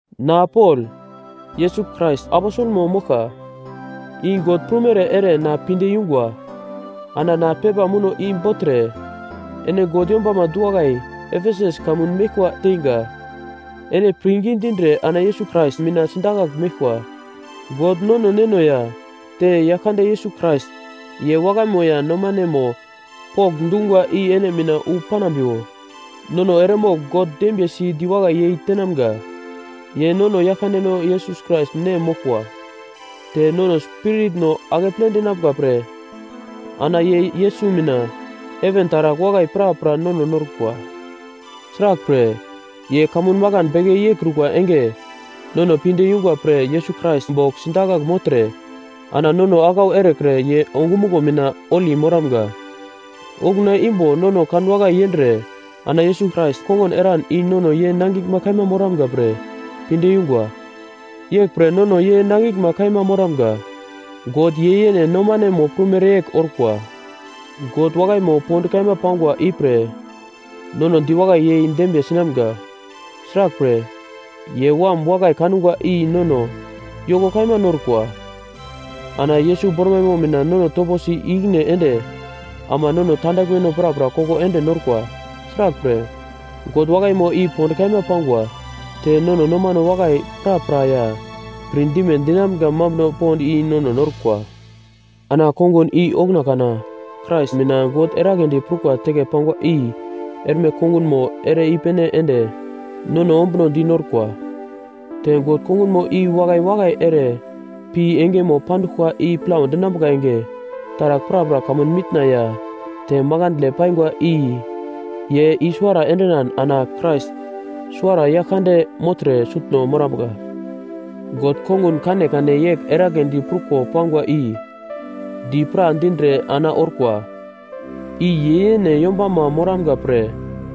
Na Pol, Yesus Krais aposelmo moglka, i God prumere ere na pinde yungwa. Ana na pepa muno i bogltre ene God yombama du-wakai Efesus kamun meglkwa teinga, ene pirngi dindre ana Yesus Krais mina sidakagl meglkwa. God nono Neno ya te Yaglkande Yesus Krais, ye wakaimo ya nomanemo pokndungwa i ene mina wu panambiwo. Nono eremogl God dembiyesi diwakai yei tenamga, ye nono Yaglkandeno Yesus Krais Nem moglkwa. Te nono spiritno akeple dinambuka pre ana ye Yesus mina heven taragl wakai prapra nono norkwa. Sraglpre, ye kamun makan beke yeikrukwa enge, nono pinde yungwa pre Yesus Krais bogl sindakagl mogltre ana nono aglau erekre ye ongumuglo mina holi moramga. Okuna imbo nono kanwakai yendre ana Yesus Krais kongun eran i nono ye nangiglma kaima moramga pre pinde yungwa. Yeglpre nono ye nangiglma kaima moramga. God ye yene nomanemo prumere yegl orkwa. God wakaimo pond kaima pangwa ipre nono diwakai yei dembiye sinamga, sraglpre, ye Wam wakai kangwa i nono yoko kaima norkwa. Ana Yesus bormaimo mina nono toposi i-ikine ende ama nono tandaglmeno prapra koko ende norkwa. Sraglpre, God wakaimo i pond kaima pangwa, te nono nomano wakai prapra ya pirdime dinamga mambuno pond i nono norkwa. Ana kongun i okuna kana Krais mina God eragledi prukwa teke pangwa i erme kongunmo ere i-pene ende nono ombuno di norkwa. Te God kongun i wakai wakai ere pi engemo panduglkwa i plau dinambuka enge, taragl prapra kamun mitna ya te makandle paingwa i ye i-suwara endinan ana Krais suwara Yaglkande mogltre sutno morambuka. God kongun kanekane yegl eragledi pruko pangwa i di pra dindre ana orkwa, i ye yene yombama moramga pre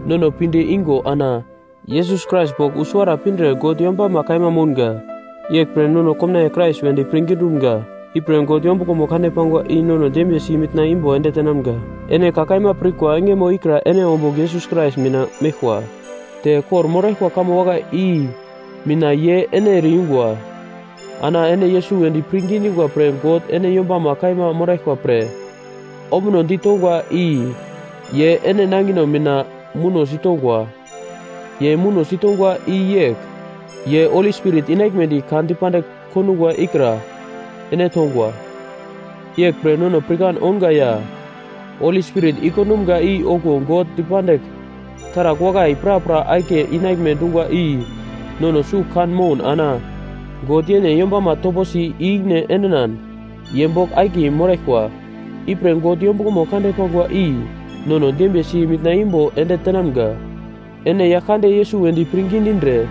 nono pinde ingo ana Yesus Krais bogl wu suwara pindre God yombama kaima mounga. Yeglpre nono komnaiye Krais wedi pirngi dumga, ipre God yombuglomo kande pangwa i nono dembiye si mitna imbo ende tenamga. Ene ka kaima pirkwa engemo ikra ene ombugl Yesus Krais mina meglkwa, te kor-moraglkwa kamo wakai i mina ye ene ere-yungwa, ana ene Yesus wedi pirngi dingwa pre God ene yombama kaima moraglkwa pre ombunodi tongwa i ye ene nangino mina muno sitongwa. Ye muno sitongwa i yegl: Ye Holi Spirit inaglmedi ka dipandigl kondungwa ikra ene tongwa. Yeglpre nono pirkan ounga ya Holi Spirit i-kondumga i okuwo God dipandigl taragl wakai prapra akiye inaglme dungwa i nono sugl kan moun ana God yene yombama toposi i-ikine endinan ye bogl akiye moraglkwa. Ipre God yombuglomo kande pangwa i nono dembiye si mitna imbo ende tenamga. Ene Yaglkande Yesus wedi pirngi dindre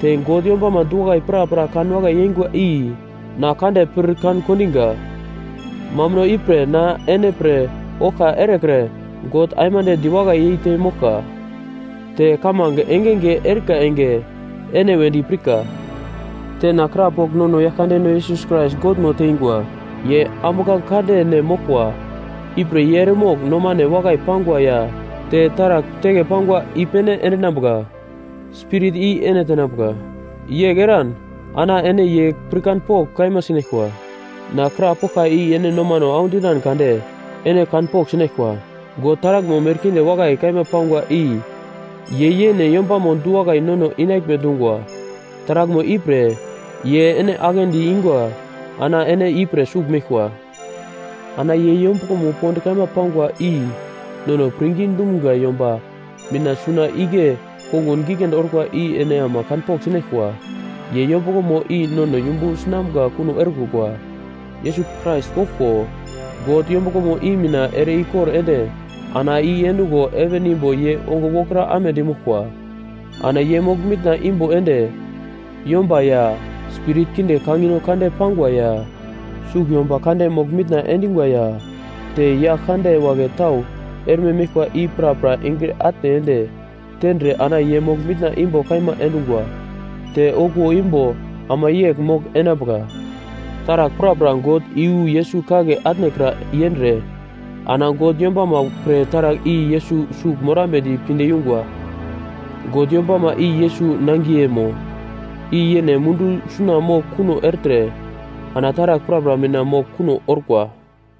te God yombama du-wakai prapra kanwakai yeingwa i na kande pir kan kondiga. Mambuno ipre na ene pre oglka erekre God aimande diwakai yeite moglka te kamange enge enge erika enge ene wedi pirka, te na krapogl nono Yaglkandeno Yesus Krais Godmo teingwa, ye ambuglange kande Nem moglkwa, ipre ye eremogl nomane wakai pangwa ya te taragl teke pangwa i-pene endinambuka Spirit i ene tenambuka, yegl eran ana ene ye pirkanpogl kaima sinaglkwa. Na krapoglka i ene nomano audinan kade ene kanpogl sinaglkwa, God taraglmo merkinde wakai kaima pangwa i ye yene yombamo du-wakai nono inaglme dungwa, taraglmo ipre ye ene aglendi ingwa ana ene ipre sugl meglkwa. Ana ye yombuglomo pond kaima pangwa i nono pirngi dumga yomba mina suna igle kongun giglendi orkwa i ene ama kanpogl sinaglkwa. Ye yombuglomo i nono yumbu sinamga kuno erekrukwa. Yesus Krais goglko God yombuglomo i mina ere ikor ende ana i endungo heven imbo ye ongo wokra amedi moglkwa. Ana ye mogl mitna imbo ende yomba ya spirit kinde kangino kande pangwa, ya sugl yomba kande mogl mitna endingwa ya te yagl kande wagle tau erme meglkwa i prapra engre atne ende tendre ana ye mogl mitna imbo kaima endungwa te okuwo imbo ama yegl mogl enambuka. Taragl prapra God i yu Yesus kagle atnekra yendre ana God yombama pre taragl i Yesus sugl morambedi pinde yungwa. God yombama i Yesus nangiyemo, i yene mundu suna mogl kuno ertre ana taragl prapra mina mogl kuno orkwa.